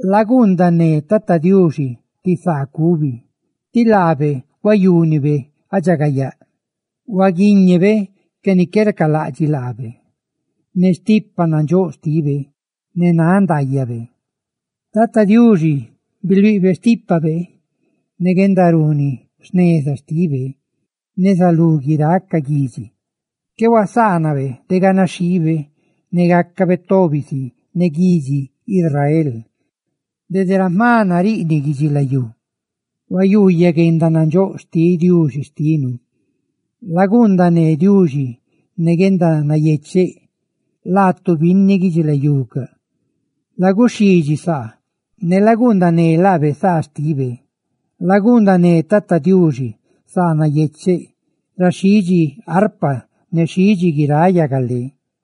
¡Laguundané Tata Diuxi ti saa cubi, tí laabe huayúnibe guendaridxagayaa! ¡Huaguíñebe ca ni qué racalaꞌdxiꞌ laabe ne stipa nandxóꞌ xtibe, ne náꞌ ndaayabe! Tata Diuxi biluiꞌbe xtípabe, ne guendaruni jneza xtibe neza lú guiráꞌ ca guidxi; qué huasaanabe de ganaxhiibe ne gácabe tobi si ne guidxi Israel. ¡Dede ra jma nariꞌniꞌ guidxilayú huyuuyaꞌ guendanandxóꞌ xtiꞌ Diuxi xtinu! Laguundané Diuxi ne guendanayecheꞌ, laatu binni guidxilayucaꞌ; la guxidxisá ne laguundané laabe saa xtibe. Laguundané Tata Diuxi saa nayecheꞌ ra xhidxi arpa ne ra xhidxi guiráꞌ yagalé.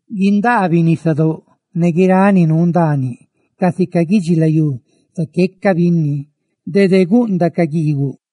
Guindaabiꞌ nisadóꞌ ne guiráꞌ ni nuu ndaaniꞌ, casica guidxilayú, zaqueca binni; dede capanáꞌ ca guiiguꞌ;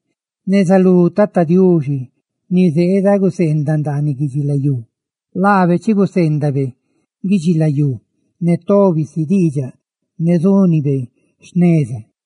neza lú Tata Diuxi, ni zeeda gacaꞌ ni ná ndaaniꞌ guidxilayú. Laabe zulídxibe guidxilayú ne tobi si diidxaꞌ ne zúnibe jneza.